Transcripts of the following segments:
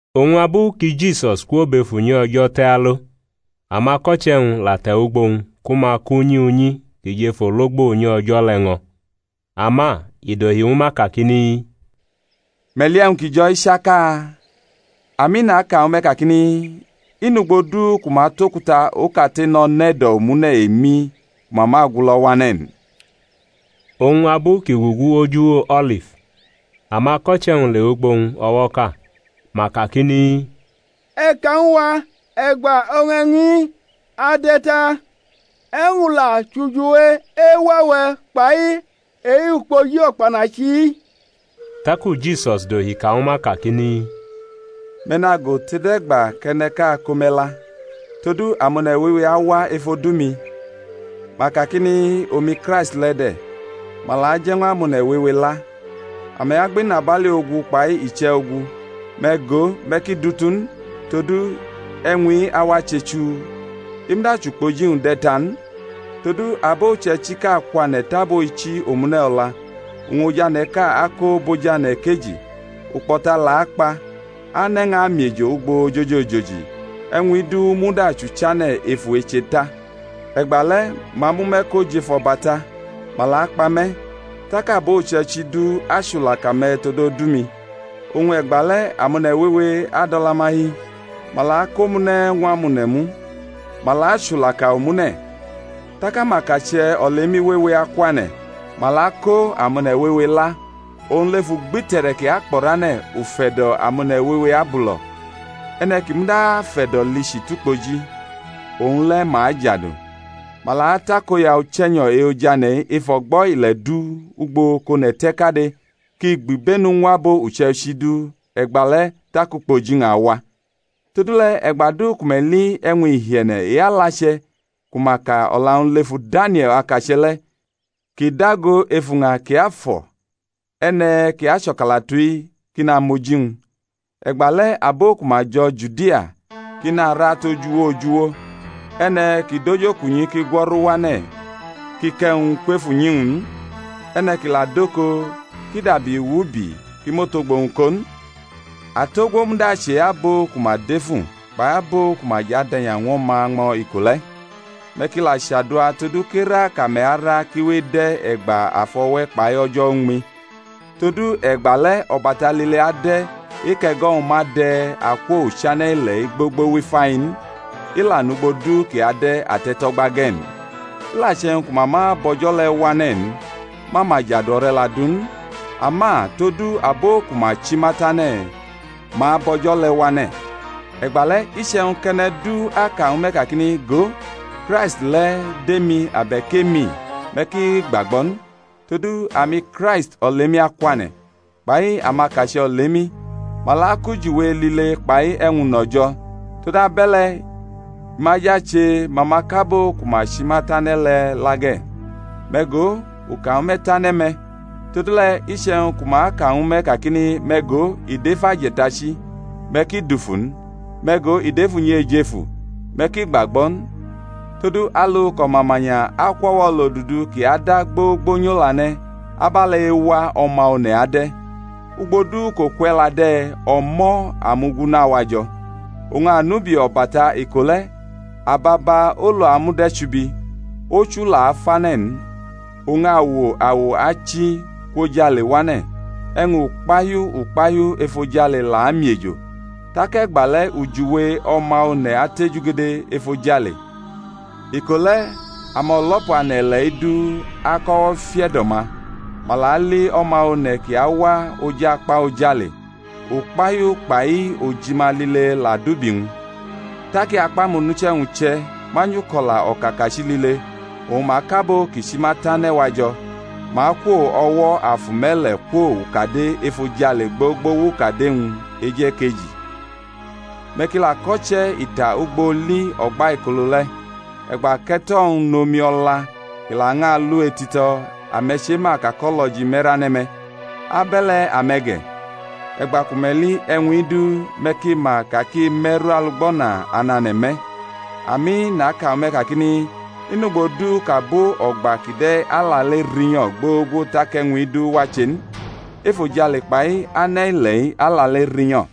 Oñ abu ki Jisus kwo bʼef unyi O̩jo̩ te̩ alo, amako̩che̩-wñ la te̩wʼugbo-wñ ku ma kʼunyi unyi ki jʼef ologbo unyi O̩jo̩ le̩ ñʼo̩. Ama i dohi ñwu ma kakini, Me̩ li e̩wñ ki jo̩-i chaka? Ami, naka ñwu me̩ kakini, I nʼugbo du ku ma atʼokuta okate no̩ nʼe̩do̩ omune̩ emi ku ma ma agulo̩ wane̩ n. Oñ abu kʼi gugu oj uwo O̩lif, amako̩che̩-wñ lewʼugbo-wñ o̩wo̩ʼka; ma kakini, E̩ ka ñw a, e̩gba oñ e̩wñ-i ade̩ ta? E̩wñ la chʼujiwe ewa-we̩, kpai e-ukpoji o̩kpanachi-i? Taku Jisus dohi ka ñwu ma kakini, Me̩ nago tode̩gba kʼe̩ne̩ʼka ako me̩ la. Todu amone̩ wewe awa ef odu-mi, ma kakini, Omi Kraisti le̩ de̩; ma la aje̩ ñw amone̩ wewe la. Ame̩ agbʼinabali ogu kpai iche̩ ogu; me̩ go, me̩ ki dutu n, todu e̩wñ-i awache chuu. I muda chʼukpoji-wñ de̩ ta n. Todu abo uche̩ichiʼka akwane̩ tʼabo ichi omune̩ o̩la, oñ ojane̩ʼka ako bʼojane̩ ekeji; ukpo̩ta la akpa, ane̩ ñʼamiejo ugbo ojoji ojoji. E̩wñ-i du muda chʼuchane̩ efu eche ta. E̩gba le̩ ma amʼume̩ ko jʼef o̩bata, ma la akpa me̩. Tak abo uche̩ichi du achʼulaka me̩ tod odu-mi. Oñ e̩gba le̩ amone̩ wewe adʼo̩la-ma hi, ma la akʼomune̩ ñw amone̩ mu, ma la achulaka omune̩. Tak amakache̩ olemi wewe akwane̩, ma la ako amone̩ wewe la. Oñ lef ugbite̩re̩ ki akpo̩rane̩ ufe̩do̩ amone̩ wewe abulo̩; e̩ne̩ ki muda afʼe̩do̩ lichi tʼukpoji, owñ le̩ ma ajadu. Ma la atakoya Uche̩nyo̩ e-Ojane̩-i ef o̩gbo̩ ile̩ du ugbo kʼone̩ te̩ kade kʼi gbʼibenu ñw abo uche̩ichi du; e̩gba le̩ tak ukpoji-wñ awa. Todule̩, e̩gba du ku me̩ li e̩wñ ihie̩ne̩ e-alache̩, ku ma ka o̩la-wñ lefu Danie̩l akache̩ le̩, kʼi dago ef uña kiafo̩ (e̩ne̩ ki acho̩kalatu-i kʼi namʼoji-wñ), e̩gba le̩ abo ku ma jo̩ Judia ki nara tʼoj uwo oj uwo. E̩ne̩ ki dʼojokunyi ki gwo̩ru wane̩ kʼi kʼe̩wñ kwef unyi-wñ n. E̩ne̩ ki la dʼoko kʼi dabi wubi kʼi mʼotogbo-wñ ko n. Atogwo, muda achʼe-abo ku ma defu, kpai abo ku ma jʼad e̩nya ñw o̩ma ñmo̩ iko le̩! Me̩ ki la chaduwa todu kʼera kʼame̩ ara ki we ede̩ e̩gba afʼowe̩ kpai o̩jo̩ uñmi; todu e̩gba le̩ o̩bata lile ade̩ e-kʼe̩go̩-wñ ma de̩ akwo uchane̩ ile̩-i gbogbo wʼifai n; i la nʼugbo du kʼi ade̩ ate̩tʼo̩gba ge̩ n. I la che̩wñ ku ma ma bʼo̩jo̩ le̩ wane̩ n, ma ma jadu o̩re̩la du n. Ama todu abo ku ma chi ma tane̩, ma abʼo̩jo̩ le̩ wane̩. E̩gba le̩ iche̩wñ kʼe̩ne̩ du aka ñwu me̩ kakini, go, Kraisti le̩ dʼemi, abe̩k e̩mi-i, me̩ ki gbagbo̩ n. Todu amiKraisti olemi akwane̩, kpai amakache̩ olemi, ma la akʼujiwe lile kpai e̩wñ uno̩ jo̩; todabe̩le̩, i ma jʼache ma ma ko abo ku ma chi ma tane̩ le̩ la ge̩. Me̩ go, u ka ñwu me̩ tane̩ me̩. Todule̩, iche̩wñ ku ma aka ñwu me̩ kakini, Me̩ go, i dʼef aje̩tachi; me̩ ki dufu n. Me̩ go, i dʼef unyi ejefu; me̩ ki gbagbo̩ n. Todu alu kʼo̩mamanya akwʼo̩wo̩ olodudu kʼi ada gbogbo nyʼolane̩, abe̩le̩ ewa O̩ma One̩ ade̩. Ugbo du kʼoku e̩la de̩, o̩mo̩ amu-gunu awajo̩. Oñ anubi o̩bata iko le̩ ababa olu amud e̩chubi, ochu la afane̩ n, oñ awo awo achi kwʼojale wane̩, e̩wñ ukpahiu ukpahiu efojale la amiejo. Tak e̩gba le̩ ujiwe O̩ma One̩ atejugede efojale; iko le̩ amo̩lo̩pu ane̩ ile̩-i du akʼo̩wo̩ fiʼe̩do̩-ma, ma la ali O̩ma One̩ kʼi awa oj akpa ojale; ukpahiu kpai ojima lile la adʼubi-wñ. Tak i akpʼamonuche̩-wñ uche̩ manyʼuko̩la o̩kakachi lile, oñ ma kʼabo-wñ kʼi chi ma tane̩ wajo̩, ma akwo o̩wo̩ afu me̩le̩ kwo ukade efojale gbogbo wʼukade-wñ e̩jekeji. Me̩ ki la ko̩che̩ ita ugbo oli o̩gbaikolo le̩; e̩gba kʼe̩to̩-wñ nʼomi o̩la kʼi lañʼalu etito̩, ame̩ chema ka kʼo̩lo̩ji me̩rane̩ me̩: abe̩le̩ ame̩ ge̩, e̩gba ku me̩ li e̩wñ-i du me̩ ki ma ka kʼi me̩rʼalugbana anane̩ me̩. Ami, naka ñwu me̩ kakini, I nʼugbo du kʼabo o̩gba kide̩ alale rinyo̩ gbogbo tak e̩wñ-i du wache n. Efojale kpai ane̩ ile̩-i alale rinyo̩;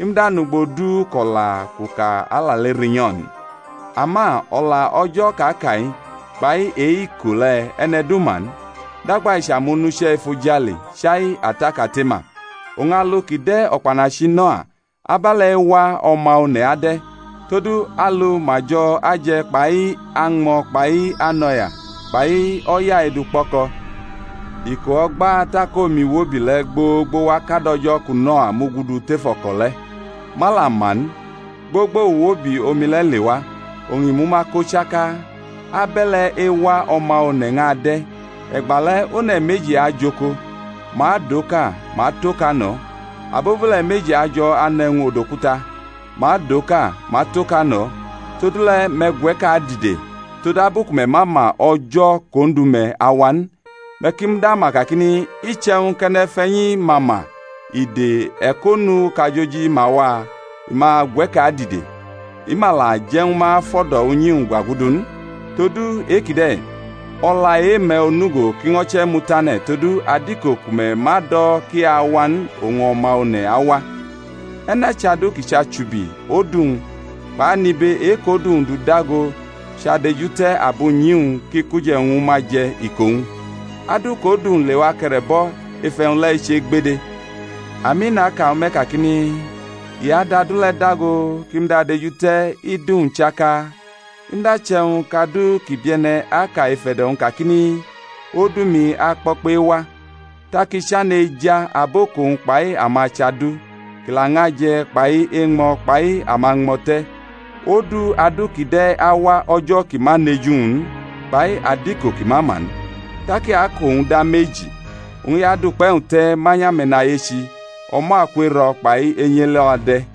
i muda nʼugbo du kʼo̩la kʼu ka alale rinyo̩ n. Ama o̩la o̩jo̩ kʼa ka-i kpai e-iko le̩, e̩ne̩ du ma n, dagba i chʼamonuche̩ efojale, chai Ata kate ma. Oñ alu ki de̩ o̩kpanachi Noa, abe̩le̩ ewa O̩ma One̩ ade̩. Todu alu ma jo̩ aje̩ kpai añmo̩ kpai anʼo̩ya kpai o̩ya edukpʼo̩ko̩ iko o̩gba tak omi wobi le̩ gbogbo wa kad o̩jo̩ ku Noa mugudu tef o̩ko̩ le̩, ma la ma n, gbogbo uwobi omi le̩ lewa, oñ i mʼuma ko chaka; abe̩le̩ ewa O̩ma One̩ ñʼade̩. E̩gba le̩ one̩ meji ajʼoko; ma adʼoka, ma atʼoka no̩; abobule̩ meji ajo̩ anʼe̩wñ odokuta; ma adʼoka, ma atʼoka no̩. Todule̩, me̩ gwe̩ke̩ adide, todabu ku me̩ ma ma o̩jo̩ kʼOndu-me̩ awa n. Me̩ ki muda ma kakini, Iche̩wñ kʼe̩ne̩fe̩nyi ma ma ide e̩konu kʼajoji ma wa, i ma gwe̩ke̩ adide; i ma la je̩ ñwu ma fʼo̩do̩ unyi-wñ gwa gudu n. Todu e-kide̩, o̩la e-me̩ onugo ki ño̩ che̩mu tane̩; todu adiko ku me̩ ma do̩ kʼi awa n oñ O̩ma One̩ awa. E̩ne̩ chʼadu kʼi chʼachubi odu-wñ kpai anibe e-kʼodu-wñ dʼu dago chʼadejute̩ abunyi-wñ kʼi kʼuje̩wñ ñwu ma je̩ iko-wñ? Adu kʼodu-wñ lewa ke̩re̩bʼo̩ ef e̩wñ le̩ eche gbede. Ami, naka ñwu me̩ kakini, I adʼadu le̩ dago kʼi mud adejute̩ idu-wñ chaka. I muda che̩wñ kʼadu ki bie̩ne̩ aka ef e̩do̩-wñ kakini, Odumi akpo̩kpe̩ ewa; tak i chane̩ eja abo kʼowñ kpai ama chʼadu, kʼi lañʼaje̩ kpai eñmo̩ kpai amañmo̩te̩; odu adu kide̩ awa o̩jo̩ kʼi ma nʼeju-wñ n kpai adiko kʼi ma ma n. Tak i akʼowñ da meji, oñ i adʼukpe̩-wñ te̩ manyʼame̩nayechi; o̩mo̩ aku ero̩ kpai enyi elo̩ ade̩.